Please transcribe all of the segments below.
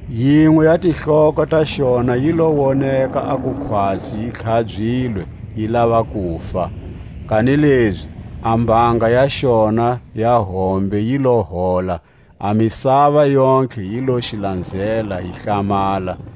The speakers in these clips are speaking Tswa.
Yinwe ya tihloko ta xona yi lo woneka a ku khwatsi yi tlhabyilwe yi lava kufa; kanilezi a mbanga ya xona ya hombe yi lo hola; a misava yontlhe yi lo xi lanzela yi hlamala.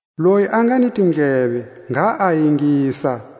Loyi a nga ni tindleve, ngha a ingisa.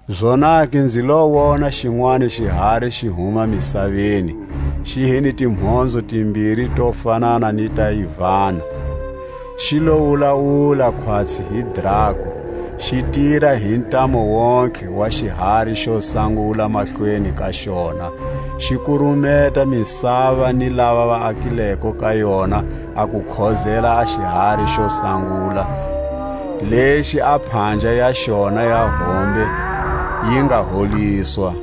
Zonake nzi lo wona xinwani xihari xi huma misaveni; xi hi ni timhonzo timbiri to fanana ni ta yivana, xi lo wulawula khwatsi hi drako. Xi tira hi ntamu wontihe wa xihari xo sangula mahlweni ka xona. Xi kurumeta misava ni lava va akileko ka yona a ku khozela a xihari xo sangula, lexi a phanja ya xona ya hombe yi nga holiswa.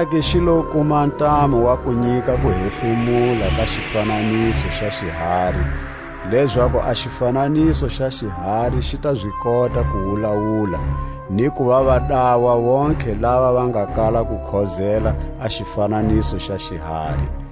Zonake xi lo kuma ntamu wa ku nyika kuhefemula ka xifananiso xa xihari, lezaku a xifananiso xa xihari xi ta zi kota ku wulawula, ni kuva va dawa vontlhe lava va nga kala ku khozela a xifananiso xa xihari.